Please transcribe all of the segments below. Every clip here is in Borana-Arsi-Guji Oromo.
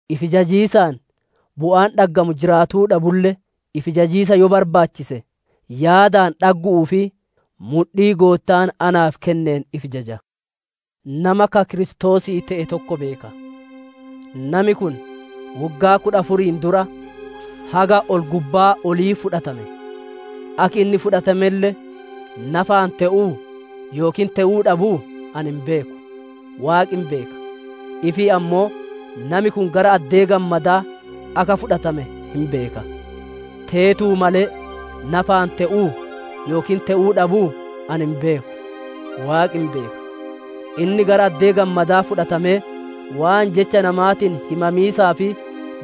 Ifi jajiisaan bu'aan dhaggamu jiraatuu dhabulle, ifi jajiisa yoo barbaachise yaadaan dhaggu'uu fi mudhii Goottaan naaf kenneen ifi jaja. Nama ka Kiristoosii te'e tokko beeka; nami kun woggaa kudha afuriin dura, haga ol gubbaa olii fudhatame; akki inni fudhatamelle nafaan te'uu yookiin te'uu dhabuu ani hin beeku; Waaqi hin beeka. Ifii ammoo nami kun gara addee gammadaa akka fudhatame hin beeka; teetuu malee nafaan te'uu yookiin te'uu dhabuu ani hin beeku; Waaqi hin beeka. Inni gara addee gammadaa fudhatamee, waan jecha namaatiin himamiisaa fi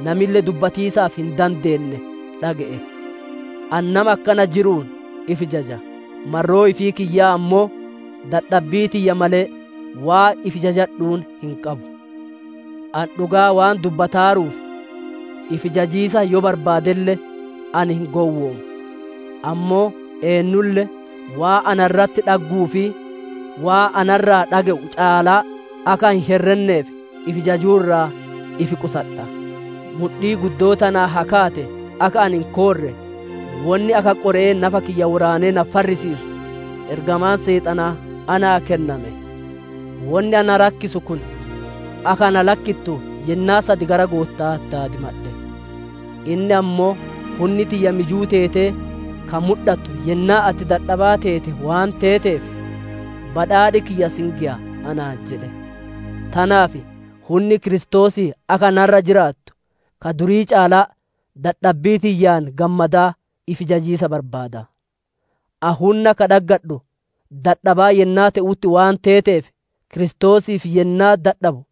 namille dubbatiisaaf hin dandeenne dhage'e. Ani nama akkana jiruun ifi jaja; marroo ifii kiyyaa ammoo, dadhabbii tiyya malee waan ifi jajadhuun hin qabu. Ani dhugaa waan dubbataaruuf, ifi jajiisa yoo barbaadelle ani hin gowwoomu; ammoo eennulle waan na irratti dhagguu fi waan na irraa dhage'u caalaa akka hin herrenneef, ifi jajuu irraa ifi qusadha. Mudhii guddoo tanaan ta kaate akka ani hin koorre, wonni akka qore'ee nafa kiyya woraanee na farrisiisu, ergamaan Seexanaa naa kenname. Wonni na rakkisu kun, akka na lakkittu yennaa sad gara Gootta'aa daadimadhe. Inni ammoo, «Hunni tiyya mijuu teetee ka mudhattu yennaa ati dadhabaa teete waan teeteef, badhaadhi kiyya si hin geya» anaan jedhe. Tanaaf hunni Kiristoosii akka ana irra jiraattu, ka durii caalaa dadhabbii tiyyaan gammadaa ifi jajiisa barbaada. Ani hunna ka dhaggadhu dadhabaa yennaa te'utti waan teeteef Kiristoosiif yennaa dadhabu,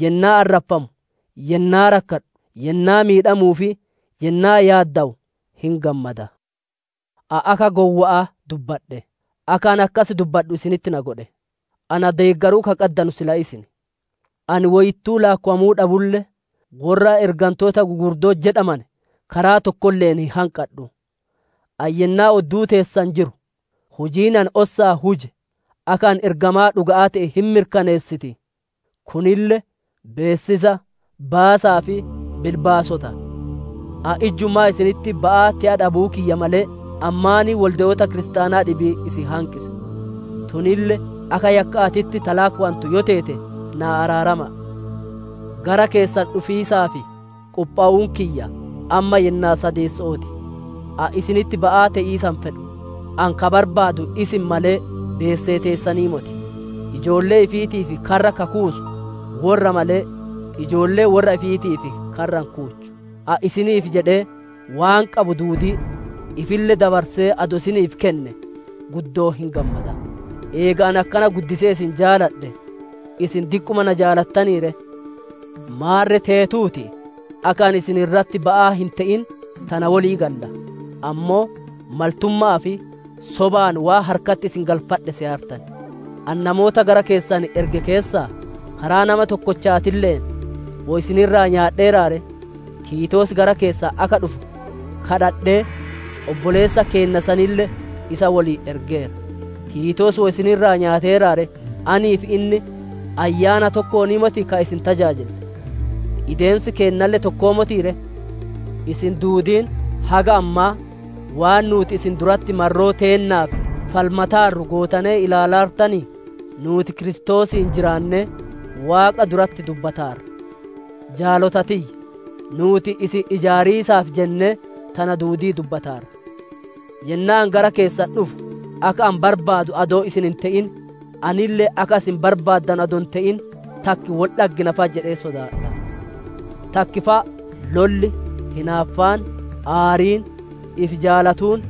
yennaa arraffamu, yennaa rakkadhu, yennaa miidhamu fi yennaa yaaddawu hin gammada. Ani akka gowwa'aa dubbadhe; akka ani akkas dubbadhu isinitti na godhe; na deeggaruu ka qaddanu silaa isin; ani woyittuu laakkowamuu dhabulle, worra ergantoota gugurdoo jedhamane karaa tokkolle'een hin hanqadhu. Ani yennaa odduu teessan jiru, hujiin ani ossaan huje, akka ani ergamaa dhuga'aa te'e hin mirkaneessiti. Kunille beessisa, baasaa fi bilbaasota. Ani ijjumaa isinitti ba'aa te'a dhabuu kiyya malee, ani maaniin wolde'oota Kiristaanaa dhibii isin hanqise? Tunille akka yakka'aatitti ta laakkowantu yoo teete naa araarama'a. Gara keessan dhufiisaaf qophowuun kiyya, amma yennaa sadeesso'oo ti; ani isinitti ba'aa te'iisa hin fedhu; ani ka barbaadu isin malee, beesee teessanii moti. Ijoollee ifiitiif karra ka kuusu worra malee, ijoolleen worra ifiitiif karra hin kuuchu. Ani isiniif jedhee waan qabu duudii, ifille dabarsee adoo isiniif kenne guddoo hin gammada. Eega ani akkana guddisee isin jaaladhe, isin diqquma na jaalatanii ree? Maarre teetuutii, akka ani isin irratti ba'aa hin te'in tana wolii galla; ammoo maltumma'aa fi sobaan waan harkatti isin galfadhe seyaartan. Ani namoota gara keessan erge keessaa, karaa nama tokkochaatille'een woy isin irraa nyaadheera ree? Tiitoos gara keessan akka dhufu kadhadhee, obboleessa keenna sanille isa woliin ergeera. Tiitoos woy isin irraa nyaateeraa ree? Anii fi inni ayyaana tokkoonii motii ka isin tajaajille? Ideensi keennalle tokkoo motii ree? Isin duudiin haga ammaa, waan nuuti isin duratti marroo teennaaf falmataarru gootanee ilaalaartanii? Nuuti Kiristoosiin jiraannee, Waaqa duratti dubbataarra. Jaalota tiyya! Nuuti isin ijaariisaaf jennee tana duudii dubbataarra. Yennaa ani gara keessan dhufu akka ani barbaadu adoo isin hin te'in, anille akka isin barbaaddanu adoo hin te'in, takki wol dhaggina fa'a jedhee sodaadha. Takki fa'a lolli, hinaaffaan, aariin, ifi jaalatuun,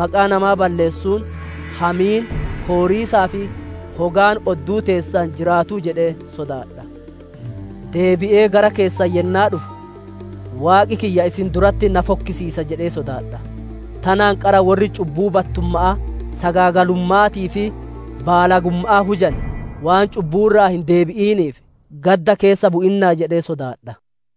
maqaa namaa balleessuun, hamiin, kooriisaa fi hogaan odduu teessan jiraatuu jedhee sodaadha'a. Deebi'ee gara keessan yennaa dhufu, Waaqi kiyya isin duratti na fokkisiisa jedhee sodaadha; tanaan qara worri cubbuu battumma'aa, sagaagalumma'aatii fi baalagumma'aa hujane, waan cubbuu irraa hin deebi'iniif gaddda keessa bu'innaa jedhee sodaadha.